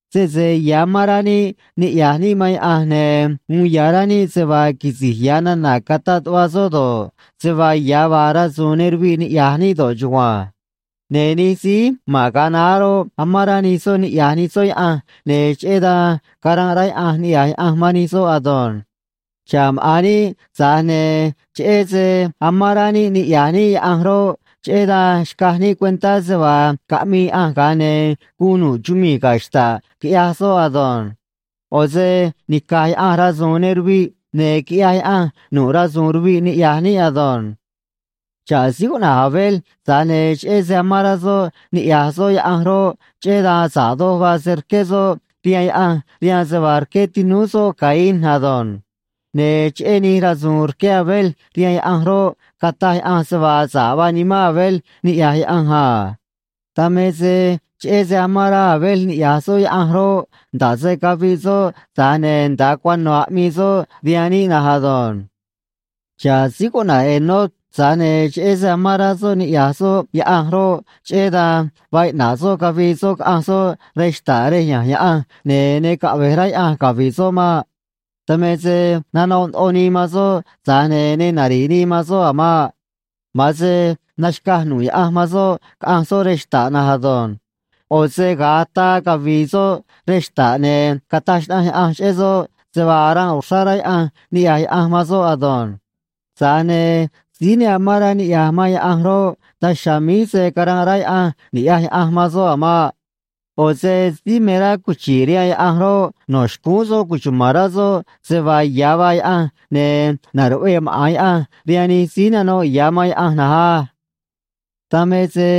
Sese ya̱ amán rá níꞌ niꞌya̱j níꞌ man Yaꞌanj, ne̱ uun ya̱ rá níꞌ se vaa quisi̱j ya̱ nana̱ cataꞌ tuꞌva soꞌ do̱ꞌ, se vaa ya̱ vaa rasu̱u̱n ne ruviꞌ niꞌya̱j níꞌ do̱ꞌ chugua̱nj. Ne̱ nij síí ma̱n ga̱a naá roꞌ, amán rá nij soꞌ niꞌya̱j nij soꞌ Yaꞌanj, ne̱ cheꞌé dan caranꞌ rá Yaꞌanj niꞌya̱j Yaꞌanj man nij soꞌ ado̱nj. Xa̱ꞌ maꞌa̱n níꞌ, tza̱j ne̱ cheꞌé se amán rá níꞌ niꞌya̱j níꞌ Yaꞌanj roꞌ, cheꞌé dan xcaj níꞌ cuentá se vaa caꞌmii Yaꞌanj, ga̱a ne̱ guun nu̱ꞌ chumii̱ ga̱ xta̱ꞌ, quiꞌyaj soꞌ ado̱nj. ꞌO̱ se nica̱j Yaꞌanj rasu̱u̱n ne ruviꞌ, ne̱ quiꞌyaj Yaꞌanj nu̱ꞌ rasu̱u̱n ruviꞌ niꞌya̱j níꞌ ado̱nj. Xa̱ꞌ síí cuꞌna̱j Abel, tza̱j ne̱ cheꞌé se amán rá soꞌ niꞌya̱j soꞌ Yaꞌanj roꞌ, cheꞌé dan sa̱ꞌ doj vaa se rqué soꞌ rihaan Yaꞌanj rihaan se vaa rqué tinúú soꞌ Caín ado̱nj. Ne̱ cheꞌé nij rasu̱u̱n rqué Abel rihaan Yaꞌanj roꞌ, cataj Yaꞌanj se vaa sa̱ꞌ vaa nimán Abel niꞌya̱j Yaꞌanj a. Dan me se cheꞌé se amán rá Abel niꞌya̱j soꞌ Yaꞌanj roꞌ, nda̱ꞌ se caviꞌ soꞌ, tza̱j ne̱ nda̱a cuano̱ aꞌmii soꞌ rihaan níꞌ na̱nj ado̱nj. Xa̱ꞌ síí cuꞌna̱j Enoc, tza̱j ne̱ cheꞌé se amán rá soꞌ niꞌya̱j soꞌ Yaꞌanj roꞌ, cheꞌé dan vaa iꞌna̱ꞌ soꞌ cavii soꞌ caꞌanj soꞌ rej xta̱ꞌ rej ya̱nj Yaꞌanj, ne̱ ne caꞌve̱j rá Yaꞌanj cavi̱ꞌ soꞌ maꞌ. Dan me se nanoꞌ ndoꞌo nii man soꞌ, tza̱j ne̱ ne nari̱ꞌ nii man soꞌ a̱ maꞌ. Ma̱an se naxca̱j nu̱ꞌ Yaꞌanj man soꞌ caꞌanj soꞌ rej xta̱ꞌ na̱nj ado̱nj. ꞌO̱ se ga̱a ataa cavi̱i̱ soꞌ rej xta̱ꞌ, ne̱ cataj xnaꞌanj Yaꞌanj cheꞌé soꞌ se vaa aranꞌ uxrá rá Yaꞌanj niꞌya̱j Yaꞌanj man soꞌ ado̱nj. Tza̱j ne̱ síí ne amán rá niꞌya̱j man Yaꞌanj roꞌ, daj chiha̱a̱ míj se̱ caranꞌ rá Yaꞌanj ni̱ꞌyaj Yaꞌanj man soꞌ a̱ maꞌ. ꞌO̱ se síí me rá cuchi̱ꞌ rihaan Yaꞌanj roꞌ, no̱ xcúún soꞌ cuchuma̱n rá soꞌ se vaa ya̱ vaa Yaꞌanj, ne̱ na̱ruꞌvee maꞌa̱n Yaꞌanj rihaan nij síí nano̱ꞌ ya̱ man Yaꞌanj na̱nj á. Dan me se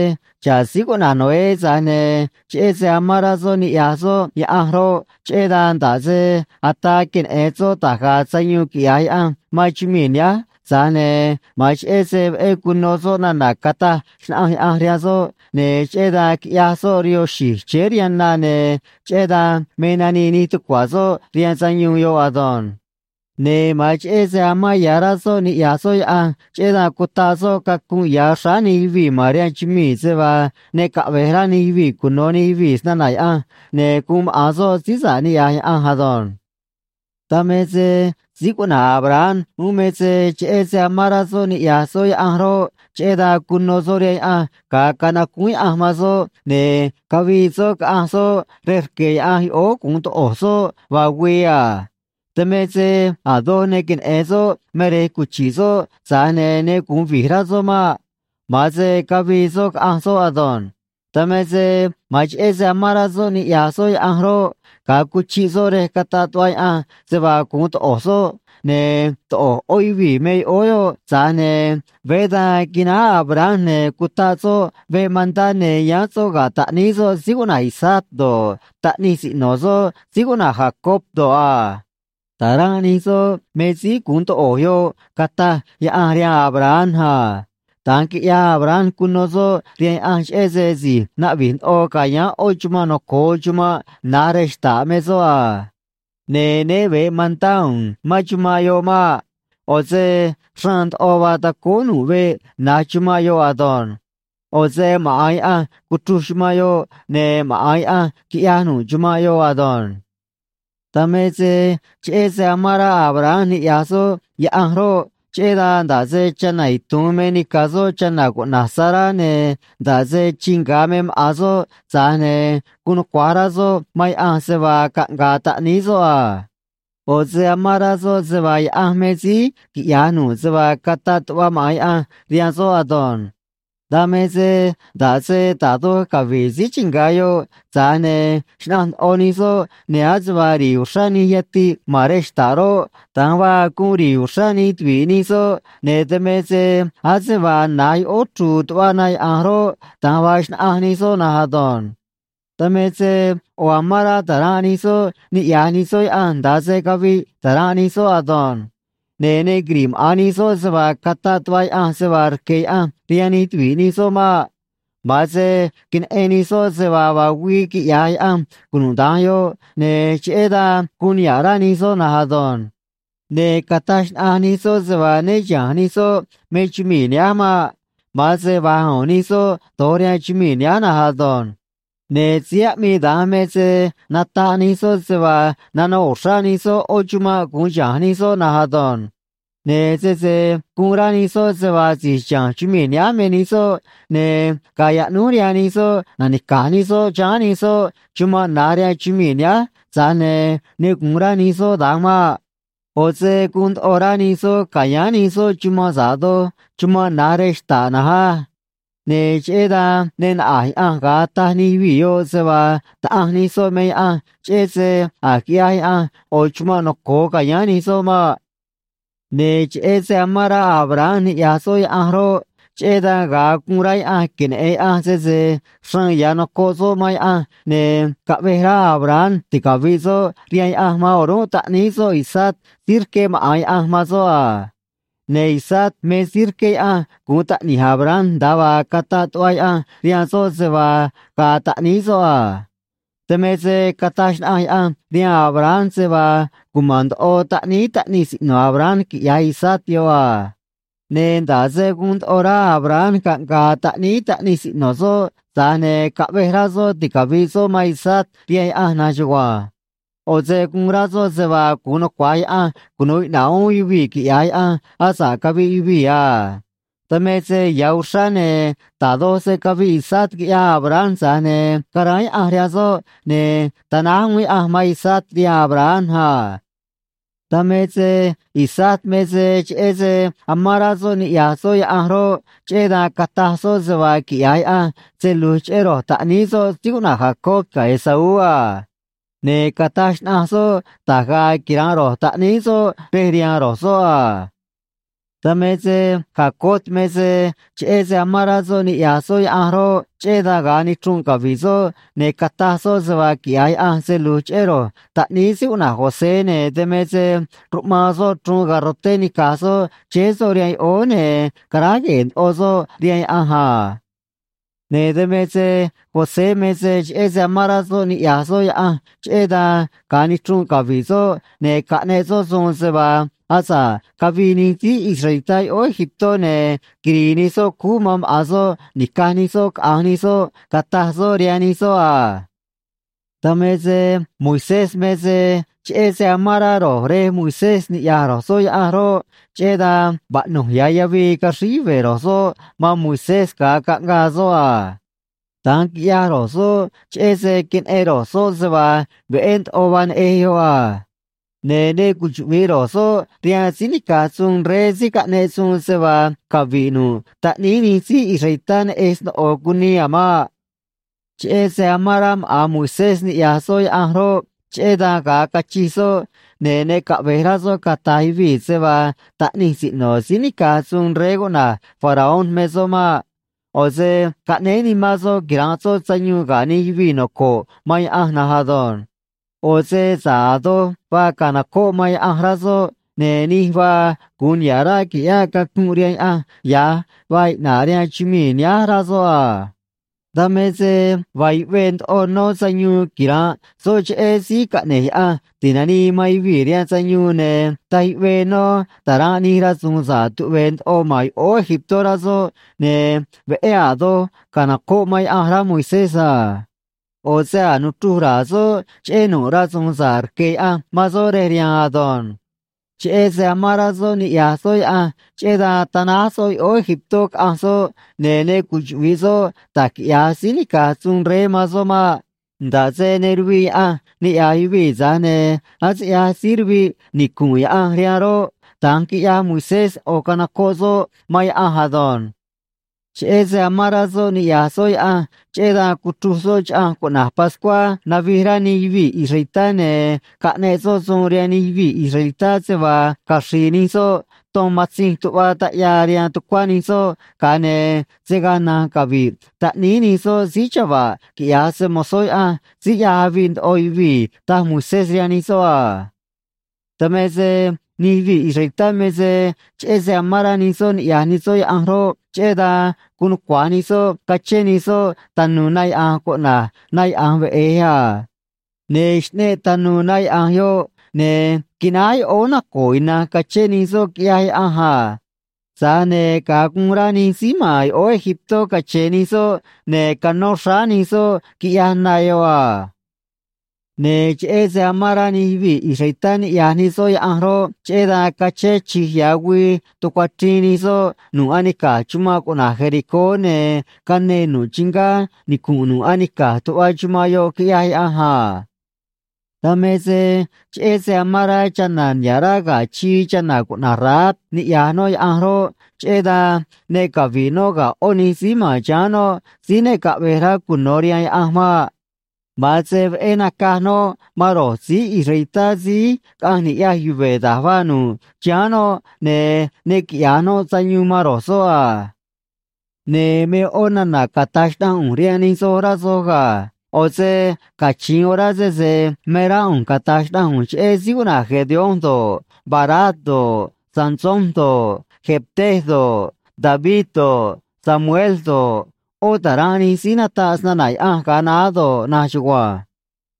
xa̱ꞌ síí cuꞌna̱j Noé, tza̱j ne̱ cheꞌé se amán rá soꞌ niꞌya̱j soꞌ Yaꞌanj roꞌ, cheꞌé dan, nda̱ꞌ se ataa queneꞌe̱n soꞌ da̱j ga̱a̱ sayuun quiꞌya̱j Yaꞌanj man chumii̱ nihánj, tza̱j ne̱ ma̱an cheꞌé se veꞌé cuno soꞌ nana̱ cataj xnaꞌanj Yaꞌanj rihaan soꞌ, ne̱ cheꞌé dan quiꞌyaj soꞌ rihoo xi̱j chéé rihaan na, ne̱ cheꞌé dan me nanii nij tucua̱ soꞌ rihaan sayuun yoꞌ ado̱nj. Ne̱ ma̱an cheꞌé se amán ya̱ rá soꞌ niꞌya̱j soꞌ Yaꞌanj, cheꞌé dan cutaꞌ soꞌ cacunꞌ ya̱ xráá nij yuvii̱ ma̱n rihaan chumii̱ se vaa ne caꞌve̱j rá nij yuvii̱ cuno̱ nij yuvii̱ snana̱ Yaꞌanj, ne̱ guun maꞌa̱n soꞌ síí sa̱ꞌ niꞌya̱j Yaꞌanj ado̱nj. Dan me se síí cuꞌna̱j Abraham uún me se cheꞌé se amán rá soꞌ niꞌya̱j soꞌ Yaꞌanj roꞌ, cheꞌé dan cuno soꞌ rihaan Yaꞌanj ga̱a canacúún Yaꞌanj man soꞌ, ne̱ cavii soꞌ caꞌanj soꞌ rej rque̱ Yaꞌanj yoꞌóó gu̱un toꞌo̱j soꞌ vaa güii a. Dan me se a̱ doj ne queneꞌe̱n soꞌ me rej cuchi̱ꞌ soꞌ, tza̱j ne̱ ne gu̱un vi̱j rá soꞌ maꞌ. Ma̱an se cavii soꞌ caꞌanj soꞌ ado̱nj. Dan me se ma̱an cheꞌé se amán rá soꞌ niꞌya̱j soꞌ Yaꞌanj roꞌ, ga̱a cuchiꞌ soꞌ rej cataꞌ tuꞌva Yaꞌanj se vaa gu̱un toꞌo̱j soꞌ, ne̱ toꞌo̱j ꞌó yuvii̱ me yoꞌóó yoꞌ, tza̱j ne̱ veé da̱nj quináj Abraham, ne̱ cutaꞌ soꞌ veꞌ mantá, ne̱ yáán soꞌ ga̱ taꞌníí soꞌ síí cuꞌna̱j Isaac do̱ꞌ, taꞌnij siꞌno̱ soꞌ síí cuꞌna̱j Jacob do̱ꞌ a. Ta̱ranꞌ nij soꞌ me síí gu̱un toꞌo̱j yoꞌ, cataj Yaꞌanj rihaan Abraham a. Da̱nj quiꞌyaj Abraham, cuno soꞌ rihaan Yaꞌanj, cheꞌé se si̱j naꞌvi̱j ndoꞌo ca̱yáán ꞌó chumanꞌ noco̱o chumanꞌ na̱j rej xta̱ꞌ me soꞌ a. Ne̱ né ve̱ꞌ mantá u̱u̱n mán chumanꞌ yoꞌ maꞌ. ꞌO̱ se xraan ndoꞌo vaa tacóó nu̱ꞌ veꞌ na̱j chumanꞌ yoꞌ ado̱nj. ꞌO̱ se maꞌa̱n Yaꞌanj cuchruj chumanꞌ yoꞌ, ne̱ maꞌa̱n Yaꞌanj quiꞌyaj nu̱ꞌ chumanꞌ yoꞌ ado̱nj. Dan me se cheꞌé se amán rá Abraham niꞌya̱j soꞌ Yaꞌanj roꞌ, cheꞌé dan nda̱ꞌ se chana̱ itu̱un me nica̱ soꞌ chana̱ cuꞌna̱j Sará, ne̱ nda̱ꞌ se chii nga̱ me maꞌa̱n soꞌ, tza̱j ne̱ guun nucua̱j rá soꞌ man Yaꞌanj se vaa caꞌnga̱a̱ taꞌníí soꞌ a. ꞌO̱ se amán rá soꞌ se vaa Yaꞌanj me síí quiꞌya̱j nu̱ꞌ se vaa cataꞌ tuꞌva maꞌa̱n Yaꞌanj rihaan soꞌ ado̱nj. Dan me se nda̱ꞌ se da̱j doj cavi̱ꞌ síí chii nga̱ yoꞌ, tza̱j ne̱ xnaꞌanj ndoꞌo nij soꞌ, ne̱ ase vaa ri̱i̱ uxrá nij yatiꞌ ma̱n rej xta̱ꞌ roꞌ, da̱nj vaa guun ri̱i̱ uxrá nij tuvi̱ꞌ nij soꞌ, ne̱ dan me se ase vaa na̱j yoꞌóó chru̱u̱ tuꞌva na yaꞌa̱nj roꞌ, da̱nj vaa xnaꞌanj nij soꞌ na̱nj ado̱nj. Dan me se ꞌo̱ amán rá ta̱ranꞌ nij soꞌ niꞌya̱j nij soꞌ Yaꞌanj nda̱a se caviꞌ ta̱ranꞌ nij soꞌ ado̱nj. Ne̱ ne quiri̱ꞌ maꞌa̱n nij soꞌ se vaa cataꞌ tuꞌva Yaꞌanj se vaa rque̱ Yaꞌanj rihaan nij tuvi̱ꞌ nij soꞌ maꞌ. Ma̱an se queneꞌen nij soꞌ se vaa vaa güii quiꞌya̱j Yaꞌanj cunuda̱nj yoꞌ, ne̱ cheꞌé dan guun niha̱ꞌ rá nij soꞌ na̱nj ado̱nj. Ne̱ cataj xnaꞌanj nij soꞌ se vaa né chiha̱nj nij soꞌ me chumii̱ nihánj maꞌ. Ma̱an se va̱j u̱u̱n nij soꞌ do̱j rihaan chumii̱ nihánj na̱nj ado̱nj. Ne̱ síí aꞌmii da̱nj me se nataꞌ nij soꞌ se vaa nanoꞌ uxrá nij soꞌ ꞌó chumanꞌ gu̱un chiha̱nj nij soꞌ na̱nj ado̱nj. Ne̱ sese guun rá nij soꞌ se vaa si̱j chiha̱nj chumii̱ nihánj me nij soꞌ, ne̱ gaa yaꞌnúj rihaan nij soꞌ na̱nica̱j nij soꞌ chiháán nij soꞌ chumanꞌ na̱j rihaan chumii̱ nihánj, tza̱j ne̱ ne gu̱un rá nij soꞌ da̱nj maꞌ. ꞌO̱ se guun ndoꞌo rá nij soꞌ ca̱yáán nij soꞌ chumanꞌ sa̱ꞌ doj chumanꞌ na̱j rej xta̱ꞌ na̱nj á. Ne̱ cheꞌé dan ne naꞌa̱j Yaꞌanj ga̱a taj nij yuvii̱ yoꞌ se vaa Taꞌanj nij soꞌ me Yaꞌanj, cheꞌé se a̱j quiꞌyaj Yaꞌanj ꞌo̱ chumanꞌ noco̱o ca̱yáán nij soꞌ maꞌ. Ne̱ cheꞌé se amán rá Abraham niꞌya̱j soꞌ Yaꞌanj roꞌ, cheꞌé dan ga̱a guun rá Yaꞌanj queneꞌe̱n Yaꞌanj sese xraan ya̱ nocoꞌ soꞌ man Yaꞌanj, ne̱ caꞌvej rá Abraham ticavi̱ꞌ soꞌ rihaan Yaꞌanj man o̱rúnꞌ taꞌníí soꞌ Isaac síí rqué maꞌa̱n Yaꞌanj man soꞌ a. Ne̱ Isaac me síí rqué Yaꞌanj guun taꞌni̱j Abraham, nda̱a vaa cataꞌ tuꞌva Yaꞌanj rihaan soꞌ se vaa ga̱a̱ taꞌníí soꞌ a. Dan me se cataj xnaꞌanj Yaꞌanj rihaan Abraham se vaa cuma̱n ndoꞌo taꞌníí taꞌnij siꞌno̱ Abraham quiꞌya̱j Isaac yoꞌ a. Ne̱ nda̱ꞌ se guun ndoꞌo rá Abraham caꞌnga̱a̱ taꞌníí taꞌnij siꞌno̱ soꞌ, tza̱j ne̱ caꞌvej rá soꞌ ticavi̱ꞌ soꞌ man Isaac rihaan Yaꞌanj na̱nj chugua̱nj. ꞌO̱ se guun rá soꞌ se vaa gu̱un nucua̱j Yaꞌanj cunu̱u iꞌna̱ꞌ uún yuvii̱ quiꞌya̱j Yaꞌanj asa̱ꞌ caviꞌ yuvii̱ a. Dan me se ya̱ uxrá, ne̱ da̱j doj se caviꞌ Isaac, quiꞌyaj Abraham, tza̱j ne̱ caráán Yaꞌanj rihaan soꞌ, ne̱ tanáj uún Yaꞌanj man Isaac rihaan Abraham a. Dan me se Isaac me se cheꞌé se amán rá soꞌ niꞌya̱j soꞌ Yaꞌanj roꞌ, cheꞌé dan cataj soꞌ se vaa quiꞌya̱j Yaꞌanj se lu̱j cheꞌé ro̱j taꞌníí soꞌ síí cuꞌna̱j Jacob ga̱ Esaú a. Ne̱ cataj xnaꞌanj soꞌ da̱j ga̱a̱ quira̱nꞌ ro̱j taꞌníí soꞌ rej rihaan ro̱j soꞌ a. Dan me se Jacob me se cheꞌé se amán rá soꞌ niꞌya̱j soꞌ Yaꞌanj roꞌ, cheꞌé dan ga̱a nichrunꞌ cavi̱ꞌ soꞌ, ne̱ cataj soꞌ se vaa quiꞌya̱j Yaꞌanj se lu̱j cheꞌé ro̱j taꞌníí síí cuꞌna̱j José, ne̱ dan me se ruꞌmaan soꞌ chruun garroté nica̱j soꞌ chéé soꞌ rihaan yoꞌóó, ne̱ caráj gue̱e̱ ndoꞌo soꞌ rihaan Yaꞌanj a. Ne̱ dan me se José me se cheꞌé se amán rá soꞌ niꞌya̱j soꞌ Yaꞌanj, cheꞌé dan ga̱a nichrunꞌ cavi̱ꞌ soꞌ, ne̱ caꞌneꞌ soꞌ suun se vaa asa̱ꞌ cavii nij síí israelitá yoꞌóó Egiptó, ne̱ quiri̱i̱ nij soꞌ cúú man maꞌa̱n soꞌ ni̱caj nij soꞌ caꞌa̱nj nij soꞌ, cataj soꞌ rihaan nij soꞌ a. Dan me se Moisés me se cheꞌé se amán rá ro̱j rej Moisés niꞌya̱j ro̱j soꞌ Yaꞌanj roꞌ, cheꞌé dan vaꞌnu̱j ya̱ yavii caxríj yuve̱ ro̱j soꞌ man Moisés ga̱a caꞌngaa soꞌ a. Da̱nj quiꞌyaj ro̱j soꞌ cheꞌé se queneꞌen ro̱j soꞌ se vaa veꞌé ndoꞌo vaa neꞌej yoꞌ a. Ne̱ ne cuchuꞌvi̱ꞌ ro̱j soꞌ rihaan síí nica̱j suun rey síí caꞌneꞌ suun se vaa cavi̱ꞌ nu̱ꞌ taꞌníí nij síí israelitá neꞌej sno̱ꞌo cunii a̱ maꞌ. Cheꞌé se amán rá maꞌa̱n Moisés niꞌya̱j soꞌ Yaꞌanj roꞌ, cheꞌé dan ga̱a cachij soꞌ, ne̱ ne caꞌve̱j rá soꞌ cata̱j yuvii̱ se vaa taꞌnij siꞌno̱ síí nica̱j suun rey cuꞌna̱j Faraón me soꞌ maꞌ. ꞌO̱ se caꞌnéé nimán soꞌ quira̱nꞌ soꞌ sayuun ga̱ nij yuvii̱ noco̱ꞌ man Yaꞌanj na̱nj ado̱nj. ꞌO̱ se sa̱ꞌ a̱ doj vaa ca̱nocóꞌ man Yaꞌanj, rá soꞌ, ne̱ nij vaa gu̱un niha̱ꞌ ráꞌ qui̱ꞌyáꞌ cacunꞌ rihaan Yaꞌanj ya̱j vaa iꞌna̱ꞌ rihaan chumii̱ nihánj, rá soꞌ a. Dan me se vaa yuꞌvee ndoꞌo nó sayuun quira̱nꞌ soꞌ cheꞌé Síí Caꞌne̱j Yaꞌanj Ti̱nanii man Yuvii̱ rihaan Sayuun, ne̱ taj yuꞌvee nó ta̱ranꞌ nij rasu̱u̱n sa̱ꞌ tuꞌve̱e̱ ndoꞌo ma̱n yoꞌóó Egiptó, rá soꞌ, ne̱ veꞌé a̱ doj ca̱nocóꞌ man Yaꞌanj, rá Moisés a. ꞌO̱ se a̱j nuchruj ra̱a̱ soꞌ cheꞌé nu̱ꞌ rasu̱u̱n sa̱ꞌ rque̱ Yaꞌanj man soꞌ rej riha̱a̱n ado̱nj. Cheꞌé se amán rá soꞌ niꞌya̱j soꞌ Yaꞌanj, cheꞌé dan tanáj soꞌ yoꞌóó Egiptó caꞌanj soꞌ, ne̱ ne cuchuꞌvi̱ꞌ soꞌ da̱j quiꞌya̱j síí nica̱j suun rey man soꞌ maꞌ. Nda̱ꞌ se ne ruviꞌ Yaꞌanj niꞌya̱j yuvii̱, tza̱j ne̱ ase ꞌyaj síí ruviꞌ nicu̱nꞌ Yaꞌanj rihaan roꞌ, da̱nj quiꞌyaj Moisés, ꞌo̱ canocoꞌ soꞌ man Yaꞌanj ado̱nj. Cheꞌé se amán rá soꞌ niꞌya̱j soꞌ Yaꞌanj, cheꞌé dan cuchruj soꞌ chaꞌanj cuꞌna̱j Pascuá navij rá nij yuvii̱ israelitá, ne̱ caꞌneꞌ soꞌ suun rihaan nij yuvii̱ israelitá se vaa caxri̱i̱ nij soꞌ ton matzinj tuꞌva taꞌyaa rihaan tucuá nij soꞌ, ga̱a ne̱ se̱ gaa na̱nj cavi̱ꞌ taꞌníí nij soꞌ síí chava̱ꞌ quiꞌya̱j se‑mo̱zó Yaꞌanj síí ꞌyaj aviꞌ ndoꞌo yuvii̱, taj Moisés rihaan nij soꞌ a. Dan me se nij yuvii̱ israelitá me se cheꞌé se amán rá nij soꞌ niꞌya̱j nij soꞌ Yaꞌanj roꞌ, cheꞌé dan guun nucua̱j nij soꞌ cachén nij soꞌ tanu̱u̱ na yaꞌa̱nj cuꞌna̱j Na Yaꞌa̱nj Veꞌe̱j a. Ne̱ xꞌneꞌ tanu̱u̱ na yaꞌa̱nj yoꞌ, ne̱ quináj yoꞌóó naco̱o̱ ina̱nj cachén nij soꞌ, quiꞌyaj Yaꞌanj a. Tza̱j ne̱ ga̱a guun rá nij síí ma̱n yoꞌóó Egiptó cache̱n nij soꞌ, ne̱ canó xráá nij soꞌ, quiꞌyaj na yoꞌ a. Ne̱ cheꞌé se amán rá nij yuvii̱ israelitá niꞌya̱j nij soꞌ Yaꞌanj roꞌ, cheꞌé dan cachén chi̱j ya̱ güii tucuachriin nij soꞌ nu̱ꞌ anica̱j chumanꞌ cuꞌna̱j Jericó, ne̱ canee nu̱ꞌ chingá nicu̱nꞌ nu̱ꞌ anica̱j tuꞌva chumanꞌ yoꞌ, quiꞌyaj Yaꞌanj a. Dan me se cheꞌé se amán rá chana̱ niha̱ꞌ rá ga̱ chii, chana̱ cuꞌna̱j Rahab niꞌya̱j noꞌ Yaꞌanj roꞌ, cheꞌé dan ne cavi̱ꞌ noꞌ ga̱ ꞌó nij síí ma̱n chiháán noꞌ síí ne caꞌve̱j rá cuno̱ rihaan Yaꞌanj maꞌ. Ma̱an se veꞌé nacaj noꞌ man ro̱j síí israelitá síí caꞌanj ni̱ꞌyaj yuve̱ da̱j vaa nu̱ꞌ chiháán noꞌ, ne̱ ne quiꞌya̱j noꞌ sayuun man ro̱j soꞌ a. Ne̱ me ꞌó nana̱ cata̱j xnaꞌanj ꞌu̱nj rihaan nij soj, rá soj ga̱. ꞌO̱ se cachi̱in orá sese me rá ꞌu̱nj cata̱j xnaꞌanj ꞌu̱nj cheꞌé síí cuꞌna̱j Gedeón do̱ꞌ, Barac do̱ꞌ, Sansón do̱ꞌ, Jefté do̱ꞌ, David do̱ꞌ, Samuel do̱ꞌ, ꞌó ta̱ranꞌ nij síí nataꞌ snana̱ Yaꞌanj ga̱a naá do̱ꞌ na̱nj chugua̱nj.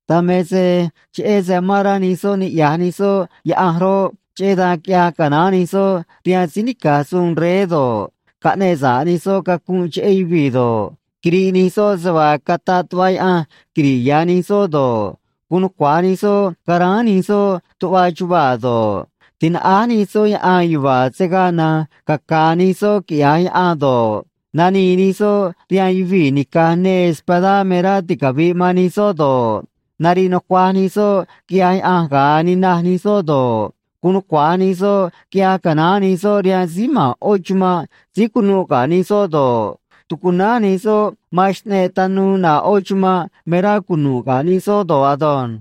Dan me se cheꞌé se amán rá nij soꞌ niꞌya̱j nij soꞌ Yaꞌanj roꞌ, cheꞌé dan quiꞌyaj canaán nij soꞌ rihaan síí nica̱j suun rey do̱ꞌ, caꞌneꞌ sa̱ꞌ nij soꞌ cacunꞌ cheꞌé yuvii̱ do̱ꞌ, quiriꞌ nij soꞌ se vaa cataꞌ tuꞌva Yaꞌanj quiri̱ꞌ ya̱ nij soꞌ do̱ꞌ, guun nucua̱j nij soꞌ caráán nij soꞌ tuꞌva chuvaa̱ do̱ꞌ, tinaꞌáj nij soꞌ yaꞌan yuva̱a̱ se̱ gaa na̱nj caca̱a̱ nij soꞌ quiꞌya̱j yaꞌan do̱ꞌ, nanii nij soꞌ rihaan yuvii̱ nica̱j neê espadá me rá ticavi̱ꞌ man nij soꞌ do̱ꞌ, nariꞌ nucuaj nij soꞌ quiꞌyaj Yaꞌanj ga̱a ninaj nij soꞌ do̱ꞌ, guun nucua̱j nij soꞌ quiꞌyaj canaán nij soꞌ rihaan síí ma̱n ꞌó chumanꞌ síí cunuꞌ ga̱ nij soꞌ do̱ꞌ, tucunánj nij soꞌ man xꞌneꞌ tanuu ꞌnaꞌ ꞌó chumanꞌ me rá cunu̱ꞌ ga̱ nij soꞌ do̱ꞌ ado̱nj.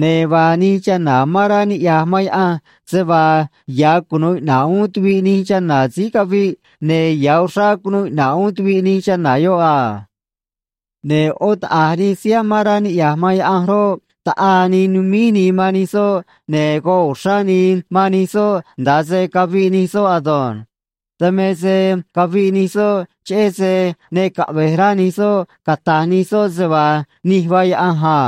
Ne̱ vaa nij chana̱ amán rá niꞌya̱j man Yaꞌanj se vaa ya̱ cunu̱u iꞌna̱ꞌ uún tuviꞌ nij chana̱ síí caviꞌ, ne̱ ya̱ uxrá cunuu iꞌna̱ꞌ uún tuviꞌ nij chana̱ yoꞌ a. Ne̱ ꞌó taꞌa̱j nij síí amán rá niꞌya̱j man Yaꞌanj roꞌ, taꞌaa nii numíj nii man nij soꞌ, ne̱ goꞌ uxrá nii man nij soꞌ nda̱a se caviꞌ nij soꞌ ado̱nj. Dan me se caviꞌ nij soꞌ cheꞌé se ne caꞌve̱j rá nij soꞌ cata̱j nij soꞌ se vaa nij vaa Yaꞌanj a.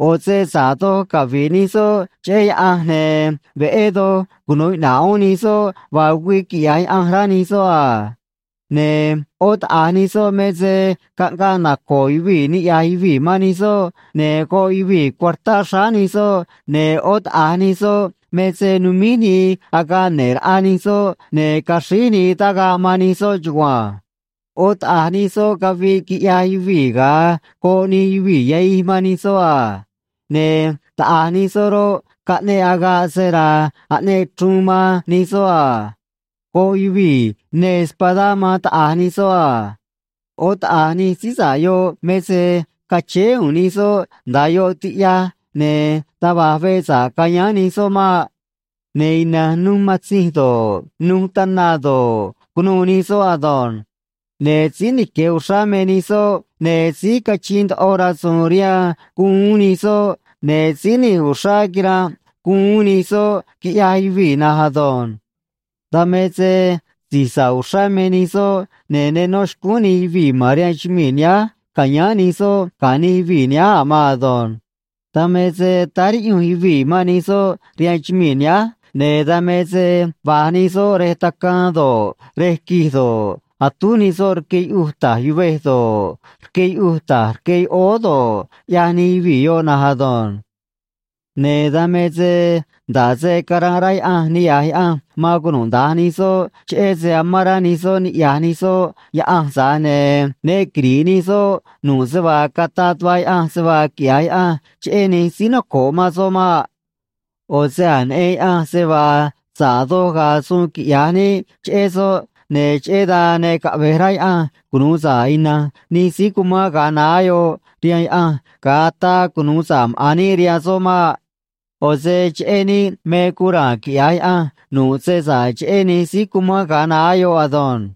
ꞌO̱ se sa̱ꞌ doj cavi̱ꞌ nij soꞌ cheꞌé Yaꞌanj, ne̱ veꞌé doj cunu̱u iꞌna̱ꞌ uún nij soꞌ vaa güii quiꞌya̱j Yaꞌanj, rá nij soꞌ a. Ne̱ ꞌó taꞌa̱j nij soꞌ me se caꞌngaꞌ naco̱o̱ yuvii̱ niꞌya̱j yuvii̱ man nij soꞌ, ne̱ goꞌ yuvii̱ cuartá xráá nij soꞌ, ne̱ ꞌó taꞌa̱j nij soꞌ me se numíj nii agaꞌ ne̱ꞌ raꞌa nij soꞌ, ne̱ caxríj nii tagaꞌ man nij soꞌ chugua̱nj. ꞌÓ taꞌa̱j nij soꞌ caviꞌ, quiꞌyaj yuvii̱ ga̱a goꞌ nij yuvii̱ yahij man nij soꞌ a. Ne̱ taꞌa̱j nij soꞌ roꞌ, caꞌneꞌ agaꞌ sera̱a̱ aꞌneꞌ chruun man nij soꞌ a. Goꞌ yuvii̱ neê espadá man taꞌa̱j nij soꞌ a. ꞌÓ taꞌa̱j nij síí sa̱ꞌ yoꞌ me se cachéé u̱u̱n nij soꞌ nda̱a yoꞌ tiꞌyaj, ne̱ taj va̱j veꞌ sa̱ꞌ cayáán nij soꞌ maꞌ. Ne̱ ina̱nj nuj matzinj do̱ꞌ, nuj tana do̱ꞌ, cunuû nij soꞌ ado̱nj. Ne̱ síí nique̱ uxrá me nij soꞌ, ne̱ síí cachiin ndoꞌo rasu̱u̱n rihaan guun uún nij soꞌ, ne̱ síí nij uxrá quiranꞌ guun uún nij soꞌ, quiꞌyaj yuvii̱ na̱nj ado̱nj. Dan me se si̱j sa̱ꞌ uxrá me nij soꞌ, ne̱ ne nó xcúún nij yuvii̱ ma̱n rihaan chumii̱ nihánj ca̱yáán nij soꞌ ga̱ nij yuvii̱ nihánj a̱ maan ado̱nj. Dan me se táá riꞌyunj yuvii̱ man nij soꞌ rihaan chumii̱ nihánj, ne̱ dan me se va̱j nij soꞌ rej tacaan do̱ꞌ, rej quij do̱ꞌ, atúj nij soꞌ rque yuꞌuj ta̱j yuvej do̱ꞌ, rque yuꞌuj ta̱j rque yoꞌóó do̱ꞌ, ꞌyaj nij yuvii̱ yoꞌ na̱nj ado̱nj. Ne̱ dan me se nda̱ꞌ se caránꞌ rá Yaꞌanj niꞌya̱j Yaꞌanj man cunuda̱nj nij soꞌ cheꞌé se amán rá nij soꞌ niꞌya̱j nij soꞌ Yaꞌanj, tza̱j ne̱ ne quiri̱ꞌ nij soꞌ nu̱ꞌ se vaa cataꞌ tuꞌva Yaꞌanj se vaa quiꞌya̱j Yaꞌanj cheꞌé nij síí noco̱ꞌ man soꞌ maꞌ. ꞌO̱ se a̱j neꞌen Yaꞌanj se vaa sa̱ꞌ doj ga̱a̱ suun quiꞌya̱j níꞌ cheꞌé soꞌ, ne̱ cheꞌé dan ne caꞌve̱j rá Yaꞌanj cunu̱u sa̱ꞌ ina̱nj nij síí cumán ga̱a naá yoꞌ rihaan Yaꞌanj, ga̱a ataa cunu̱u sa̱ꞌ maꞌa̱n níꞌ rihaan soꞌ maꞌ. ꞌO̱ se cheꞌé níꞌ me guun ra̱a̱n quiꞌya̱j Yaꞌanj nu̱ꞌ se sa̱ꞌ cheꞌé nij síí cumán ga̱a naá yoꞌ ado̱nj.